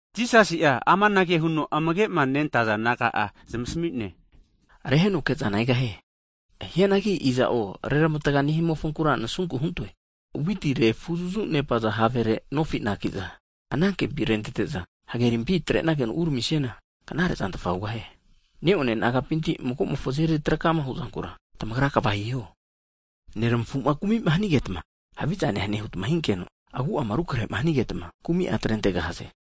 Jisasi'a amanage huno amagema nentaza disaipol naga'a zamasami'ne, Reheno kezana egahie. Hianagi iza'o reramatga nehimofonkura nasunku huntoe! Witi refuzafu nepaza havere nofi anakiza, anankempi rentete'za, hagerimpi atrenageno uramisiana knare zantfa hugahie. Neone nagapinti magomofo azeri trakama huzankura, tamagra kva hiho! Neramafuma kumima hanigeta, haviza nehane huta hinkeno, agu'ama rukrehema hanigeta, kumi'a atrentegahaze.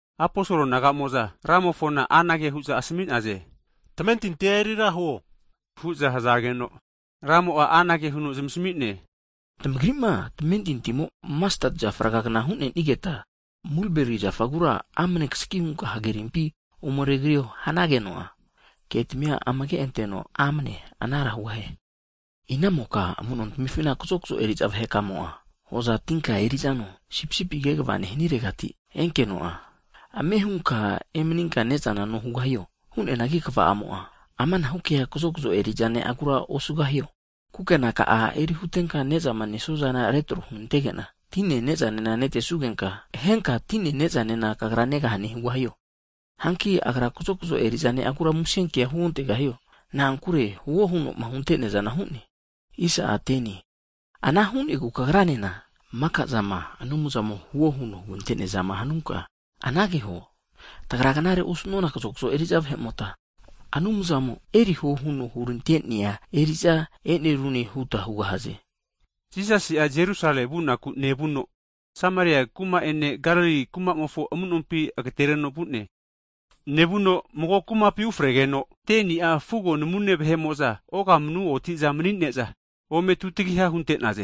Aposol naga'amo'za, Ramofona anage hu'za asmi'naze, tamentintia eri ra huo hu'za hazageno, Ramo'a anage huno zamasami'ne, Tamagrima tamementintimo'ma masteti zafa ragagna hu'nenigeta, mulberi zafagura amne tasagi hunka hagerimpi ome regrio hanageno'a, ketamia amage'anteno amne anara hugahie. Ina'imoka amuno tamifina kazokzo eri'za vahe ka'amo'ma hoza tinka eri'zano, sipisipi kegava nehaniregati enkenka, ame hunka emaninka ne'zana no hugahano? Hu'neanagi kva'amo'a amanahu kea kazokzo eri'za ne'agura osugahio, kukenaka'a eri hutenka nezama nesuazana retro hunenantege'na, tine nezanena netesugenka, henka tine nezane kagra negahane hugahie? Hanki agra kazokzo eri'za ne'agura musenkea huontegahio? Na'ankure huo huno'ma hunte'neazana hu'ne. Ana hu'negu kagranena, maka'zama Anumzamo huo huno hugante'neazama hanunka anage huo, tagra knare osunona kazokzo eriza vahemota, Anumzamo eriho huno hurante'nea eri'za e'nerune huta hugahaze. Jisasi'a Jerusalemi vunaku nevuno, Sameria kuma'ene Galili kumamofo amunompi rugitagino vu'ne. Nevuno mago kumapi ufregeno, 10ni'a fugo namune vahe'mo'za ogamnu otiza mani'ne'za ome tutagiha hunte'naze.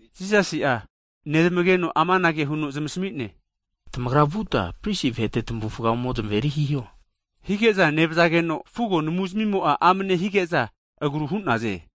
Jisasi'a nezmageno amanage huno zamasmi'ne, Tamagra vuta pristi vahete tamavufga ome zamaveri hiho, hige'za nevazageno fugo namuzmimo'a amne higeza agru hu'naze.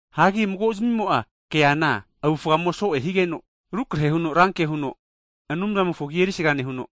Hagi mago'zmimo'a keana avufgamo so'e higeno, rukrahe huno ranke huno Anumzamofo agi erisaga nehuno,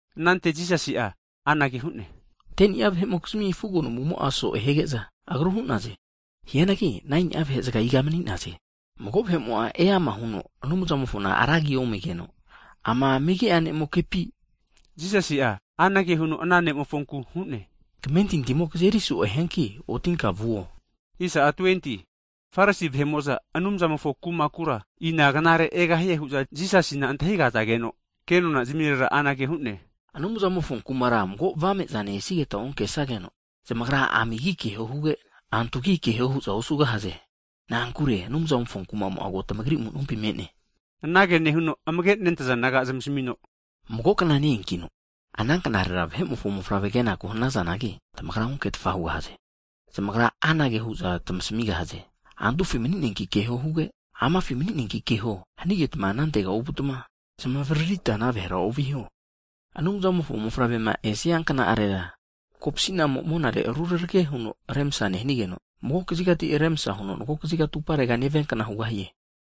Anante Jisasi'a anage hu'ne, 10ni'a vahe'mokizmi fugo namumo'a so'e hige'za agru hu'naze. Hianagi 9ni'a vahe zaga iga mani'naze? Mago vahe'mo'a eama huno Anumzamofona ra agi omigeno, ama megi'a ne'mokepi? Jisasi'a anage huno ana ne'mofonku hu'ne, Kamentintimo kazeri so'e hianka otinka vuo. Farisi vahe'mo'za Anumzamofo kumakura, inan knare egahie hu'za Jisasina antahigazageno, kenona zimirera anage hu'ne, Anumzamofo kumara mago avame'zane esigeta onkesageno, amagi keho huge, antugi keho hu'za zamagra osugahaze. Na'ankure Anumzamofo kumamo'a ko tamagri amu'nompi me'ne. Anage nehuno, amagema nentaza disaipol naga'a zamasamino, Mago kna ne-eankino, ana knarera Vahe'mofo Mofavre kenaku hanazanagi, tamagra onketfa hugahaze. Zamagra anage hu'za tmasamigahaze, antufi mani'neanki keho huge! Amafi mani'neanki keho! Hanigetma anantega ovuta, zmavaririta ana vahera oviho. Vahemofo Mofavre'ma esia kna'arera kopsi'namo monare rurarage huno remsa nehigeno, mago kazigati remsa huno mago kaziga atuparega neviankna hugahie.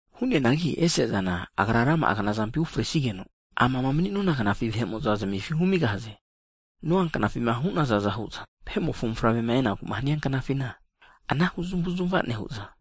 Hu'neanagi ese'zana Agra rama'a knazampi unefresigeno, ama mani'nona gnafi vahe'mo'za zmefi humigahaze. Noa knafima hu'nazaza hu'za, Vahe'mofo Mofavremoma enaku'ma hania knafina, anahu zamavuzamava nehu'za,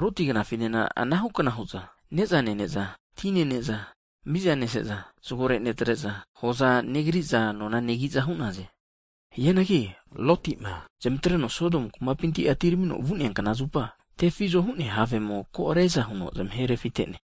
Loti gnafinena anahukna hu'za, ne'zana nene'za, tina nene'za, miza neseza, zagore netre'za hoza negriza nona negiza hu'naze. Hianagi Lotima zamatreno Sodomu kumapinti atiramino vu'nea knazupa, tefizo hu'nea havemo ko' riaza huno zamahe refite'ne.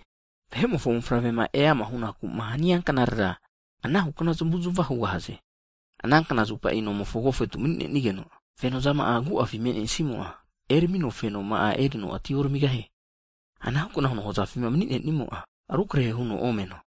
Vahe'mofo Mofavrema eama hunaku'ma hania knarera, anahukna zamavuzmava hugahaze. Ana knazupa nomofo agofetu mani'nenigeno, fenozama'a agu'afi me'nesimo'a eramino fenoma'a erino ati oramigahie. Anahukna huno hozafima mani'nenimo'a rukrehe huno omeno.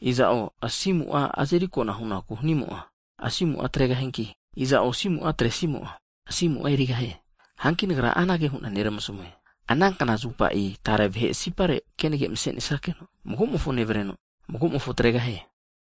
Iza'o asimu'a azeri kona hunaku hanimo'a, asimu'a atregahianki, iza'o asimu'a atresimo'a, asimu'a erigahie. Hanki Nagra anage hu'na neramasamue. Ana knazupa tare vahe sipare kenage mase'nesnake'no, mago'mofo nevreno mago'mofo atregahie.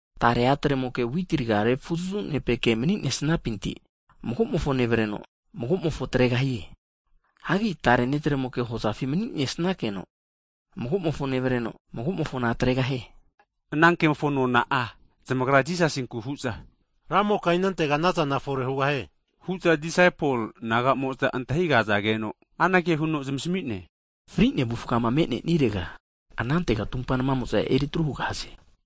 Tare atre'mokea witi raga'a refuzafunepeke mani'nesnapinti, magomofo nevreno mago'mofo atregahie. Hagi tare netremoke hozafi mani'nesnakeno, mago'mofona nevreno, mago'mofona atregahie. Anankemofo nona zamagra Jisasinku hu'za, Ramoka inantega anazana fore hugahie? Hu'za amage'ma nentaza disaipol naga'mo'za antahigazageno, anage huno zamasami'ne, Fri'nea avufgama, me'nesirega anantega tumpa namamo'za eri atru hugahaze.